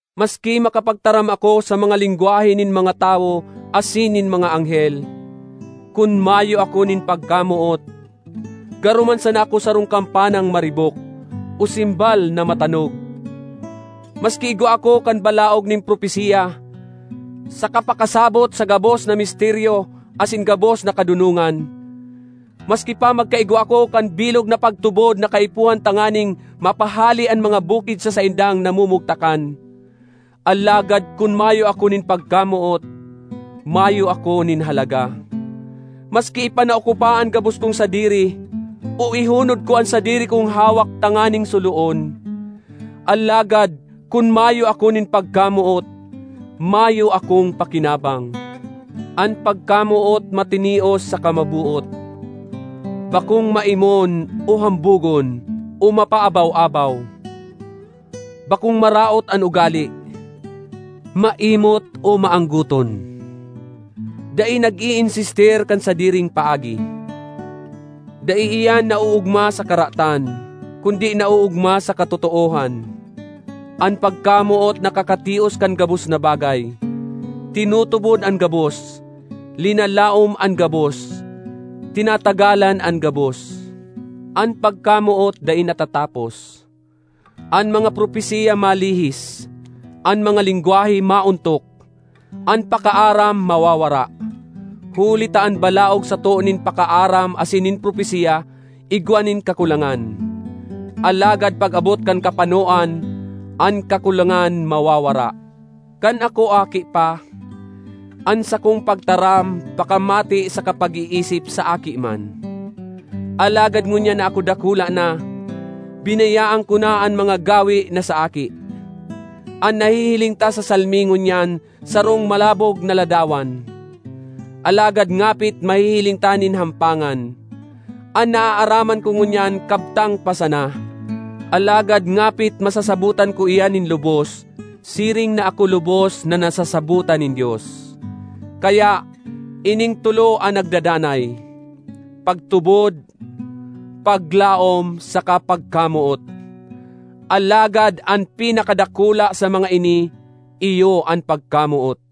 Maski makapagtaram ako sa mga lengwahe nin mga tawo asin nin mga anghel, kun mayo ako nin pagkamoot, garo man sana ako sarong kampanang maribok o gimbal (simbal)na matanog. Maski igwa ako kan balaog nin propesiya, saka pakasabot sa gabos na misteryo asin gabos na kadonongan; maski pa magkaigwa ako kan bilog na pagtubod na kaipuhan tanganing mapahale an mga bukid sa saindang namumugtakan—alagad kun mayo ako nin pagkamoot, mayo ako nin halaga. Maski ipanao ko pa an gabos kong sadiri, o ihunod ko an sadiri kong hawak tanganing suloon—alagad kun mayo ako nin pagkamoot, mayo akong pakinabang. An pagkamoot matinios saka maboot, bakong maimon o hambogon o mapaabaw-abaw; bakong maraot an ugale, maimot o maanggoton. Dai nag-iinsistir kan sadiring paagi. Dai iyan naoogma sa karatan, kundi naoogma sa katotoohan. An pagkamoot nakakatios kan gabos na bagay, tinutubod an gabos, linalaom an gabos, tinatagalan an gabos. An pagkamoot dai natatapos. An mga propesiya malihis; an mga lengwahe maontok; an pakaaram mawawara. Huli ta an balaog sato nin pakaaram asin nin propesiya igwa nin kakulangan. Alagad pag-abot kan kapanoan, an kakulangan mawawara. Kan ako aki pa, an sakong pagtaram, pakamate saka pag-iisip sa aki man. Alagad ngunyan na ako dakula na, binayaan ko na an mga gawe na sa aki. An nahihiling ta sa salming ngunyan sarong malabog na ladawan, alagad ngapit mahihiling ta nin hampangan. An naaaraman ko ngunyan kabtang pa sana; alagad ngapit masasabotan ko iyan nin lubos, siring na ako lubos na nasasabotan nin Dios. Kaya, ining tolo an nagdadanay: pagtubod, paglaom saka pagkamoot; alagad an pinakadakula sa mga ini iyo an pagkamoot.